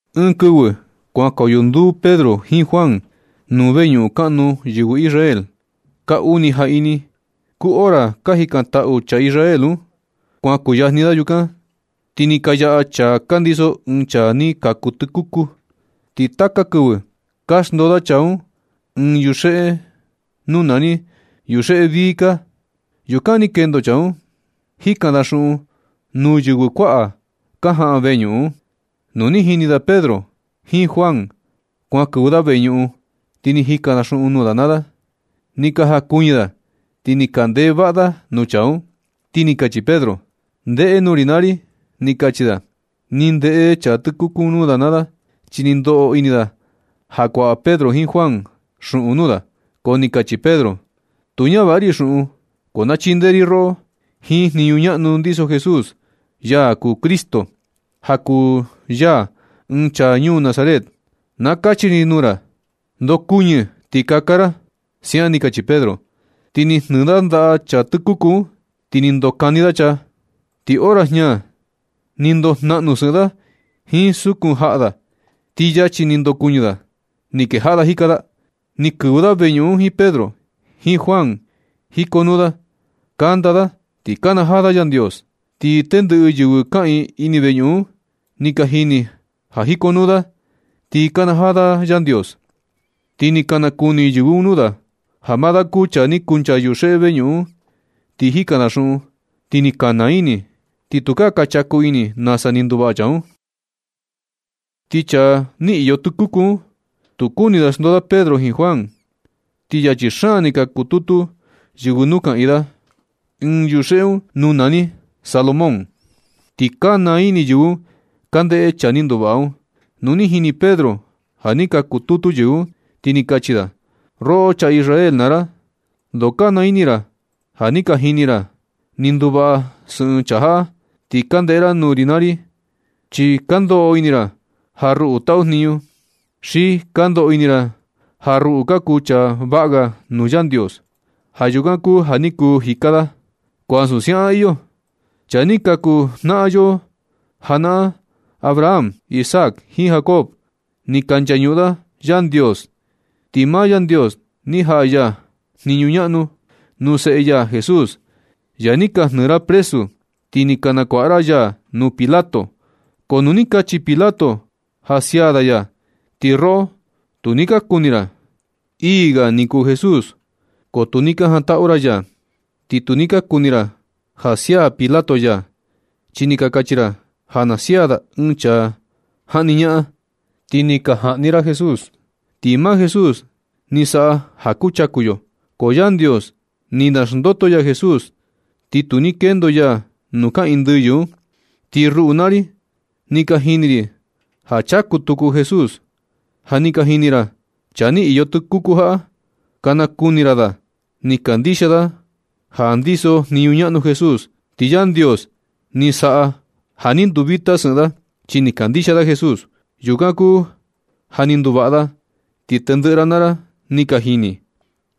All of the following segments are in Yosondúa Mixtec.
Ɨɨn kɨvɨ kuankoyo nduu Pedro jiin Juan nuu veñuꞌun kaꞌnu yɨvɨ Israel. Kaa uni jaꞌini kuu hora ka jikantaꞌu chaa Israel un. Kuan kuyajni da yukan, ti ni ka yaꞌa chaa ka ndiso ɨɨn chaa ni kaku tɨkuku. Ti taka kɨvɨ ka xndoo da chaa un ɨɨn yuxeꞌe nuu nani “yuxeꞌe vii kaa.” Yukan ni kendo chaa un, jikan da xuꞌun nuu yɨvɨ kuaꞌa ka jaꞌan veñuꞌun un. Nu ni jini da Pedro jiin Juan kuan kɨvɨ da veñuꞌun, ti ni jikan da xuꞌun nuu da naa da. Ni ka jankuɨñɨ da, ti ni ka ndeꞌe vaꞌa da nuu chaa un, ti ni kachi Pedro: ―Ndeꞌe nuu ri naa ri ―ni kachi da. Ni ndeꞌe chaa tɨkuku un nuu da naa da, chi ni ndoꞌo ini da ja kuaꞌa Pedro jiin Juan xuꞌun nuu da. Ko ni kachi Pedro: ―Tu ñavaꞌa ri xuꞌun, ko na chindee ri roꞌo. Jiin jniñu ñaꞌnu ndiso Jesús, ya kuu Cristo, ja kuu ya ɨɨn chaa ñuu Nazaret, na kachi ri nuu ra: ndokuɨñɨ ti kaka ra ―siaꞌan ni kachi Pedro. Ti ni jnɨɨ da ndaꞌa chaa tɨkuku un, ti ni ndokani da chaa. Ti hora jiña ni ndojnaꞌnu sɨꞌɨn da jiin sukun jaꞌa da. Ti yachi ni kuu ni ndokuɨñɨ da, ti ni kejaꞌa jika da. Ni kɨvɨ da veñuꞌun un jiin Pedro, jiin Juan. Jikonuu da, kanda da, ti nakanajaa da Yandios. Ti tendɨꞌɨ yɨvɨ kaꞌiin ini veñuꞌun un ni ka jini ja jikonuu da, ti nakanajaa da Yandios. Ti ni ka nakuni yɨvɨ un nuu da, ja maa da kuu chaa ni kuncha yuxeꞌe veñuꞌun un, ni jikan da xuꞌun. Ti ni ka naa ini, ti tu ka chaku ini nasa ni nduvaꞌa chaa un. Ti chaa ni iyo tɨkuku un, tu kuni da xndoo da Pedro jiin Juan. Ti yachi xaan ni ka kututu yɨvɨ nuu kaꞌiin da, ɨɨn yuxeꞌe un nuu nani “Salomón.” Ti ka naa ini yɨvɨ un ka ndeꞌe chaa ni nduvaꞌa un. Nu ni jini Pedro ja ni ka kututu yɨvɨ un, ti ni kachi da: ―Roꞌo chaa Israel naa ra. Ndoo ka naa ini ra ja ni ka jini ra ni nduvaꞌa sɨꞌɨn chaa jaꞌa. Ti ka ndeꞌe ra nuu ri naa ri, chi ka ndoꞌo ini ra ja ruꞌu taꞌu jniñu, xi ka ndoꞌo ini ra ja ruꞌu ka kuu chaa vaꞌa ga nuu Yandios. Ja yukan kuu ja ni kuu jika da. Ko ansu siaꞌan iyo. Chaa ni ka kuu jnaꞌan yo janaꞌan Abraham, Isaac, jiin Jacob, ni ka nchañuꞌun da Yandios, ti maa Yandios ni jaꞌa ya jniñu ñaꞌnu nuu seꞌe ya Jesús, ya ni ka jnɨɨ ra presu. Ti ni ka nakuaꞌa ra ya nuu Pilato. Ko nu ni kachi Pilato ja sia da ya, ti roꞌo tu ni ka kuni ra. Ii ga ni kuu Jesús, ko tu ni ka jantaꞌu ra ya. Ti tu ni ka kuni ra ja sia Pilato ya, chi ni ka kachi ra ja na sia da ɨɨn chaa jaꞌni ñaꞌan. Ti ni ka jaꞌni ra Jesús, ti maa Jesús ni saꞌa ja ka chaku yo. Ko Yandios ni naxndoto ya Jesús, ti tu ni kendo ya nuu kaꞌiin ndɨyɨ un. Ti ruꞌu naa ri, ni ka jini ri ja chaku tuku Jesús. Ja ni ka jini ra chaa ni iyo tɨkuku jaꞌa. Ka nakuni ra da. Ni kandixia da ja ndiso jniñu ñaꞌnu Jesús, ti Yandios ni saꞌa ja ni nduvita sɨꞌɨn da, chi ni kandixia da Jesús. Yukan kuu ja ni nduvaꞌa da, ti tendɨꞌɨ ra naa ra ni ka jini.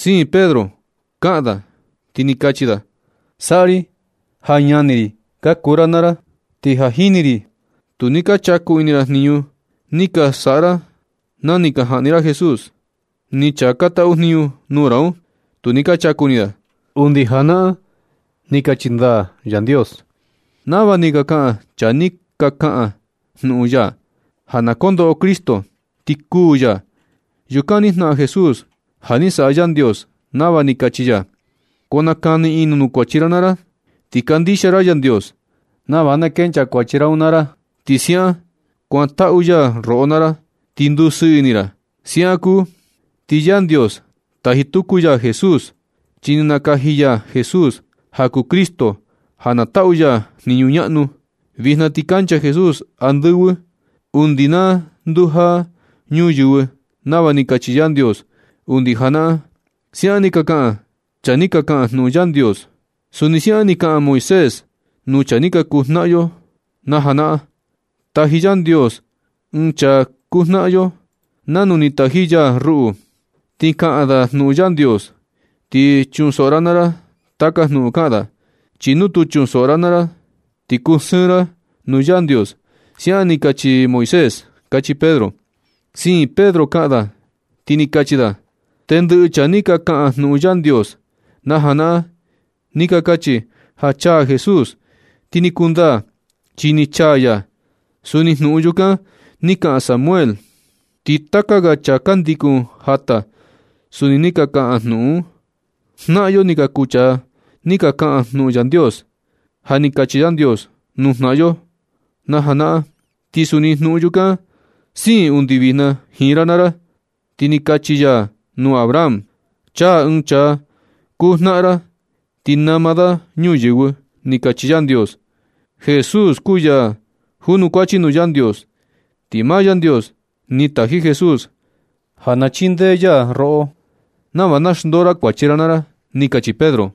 Siin Pedro kaꞌan da, ti ni kachi da: ―Saꞌa ri ja ñani ri ka kuu ra naa ra. Ti ja jini ri ja tu ni ka chaku ini ra jniñu ni ka saꞌa ra na ni ka jaꞌni ra Jesús, ni chaa ka taꞌu jniñu nuu ra un, tu ni ka chaku ini da. Undi janaꞌan ni kachi ndaa Yandios nava ni ka kaꞌan chaa ni ka kaꞌan jnuꞌun ya, ja na kondoꞌo Cristo ti kuū ya. Yukan ni jnaꞌan Jesús ja ni saꞌa Yandios nava ni kachi ya. Ko nakani ini nuu kuachi ra naa ra, ti kandixia ra Yandios, nava na kenchaa kuachi ra un naa ra. Ti siaꞌan sa kuantaꞌu ya roꞌo naa ra ti ndusɨɨ ini ra. Siaꞌan kuu, ti Yandios, taji tuku ya Jesús, chi ni nakaji ya Jesús ja kuu Cristo ja na taꞌu ya jniñu ñaꞌnu. Vijna ti kancha Jesús andɨvɨ undi na ndujaa ñuyɨvɨ, nava ni kachi Yandios undi janaꞌan. Siaꞌan ni ka kaꞌan chaa ni ka kaꞌan jnuꞌun Yandios. Suni siaꞌan ni kaꞌan Moisés nuu chaa ni ka kuu jnaꞌan yo najanaꞌan: ―Taji Yandios ɨɨn chaa kuu jnaꞌan yo nanu ni taji ya ruꞌu, ti kaꞌan da jnuꞌun Yandios. Ti chunsoꞌo ra naa ra taka jnuꞌun kaꞌan da. Chi nu tu chunsoꞌo ra naa ra, ti kusɨɨn ra nuu Yandios. Siaꞌan ni kachi Moisés ―kachi Pedro. Siin Pedro kaꞌan da, ti ni kachi da: ―Tendɨꞌɨ chaa ni ka kaꞌan jnuꞌun Yandios najanaꞌan, ni ka kachi ja chaa Jesús, ti ni kundaa, chi ni chaa ya. Suni jnuꞌun yukan ni kaꞌan Samuel, ti taka ga chaa ka ndikun jata suni ni ka kaꞌan jnuꞌun un. Jnaꞌan yo ni ka kuu chaa ni ka kaꞌan jnuꞌun Yandios. Ja ni kachi Yandios nuu jnaꞌan yo janaꞌan, ti suni jnuꞌun yukan siin undi vijna jiin ra naa ra. Ti ni kachi ya nuu Abraham: “Chaa ɨɨn chaa kuu jnaꞌan ra ti nama da ñuyɨvɨ”, ni kachi Yandios. Jesús kuu ya junukuachi nuu Yandios. Ti maa Yandios ni taji Jesús ja na chindee ya roꞌo nava na xndoo ra kuachi ra naa ra ―ni kachi Pedro.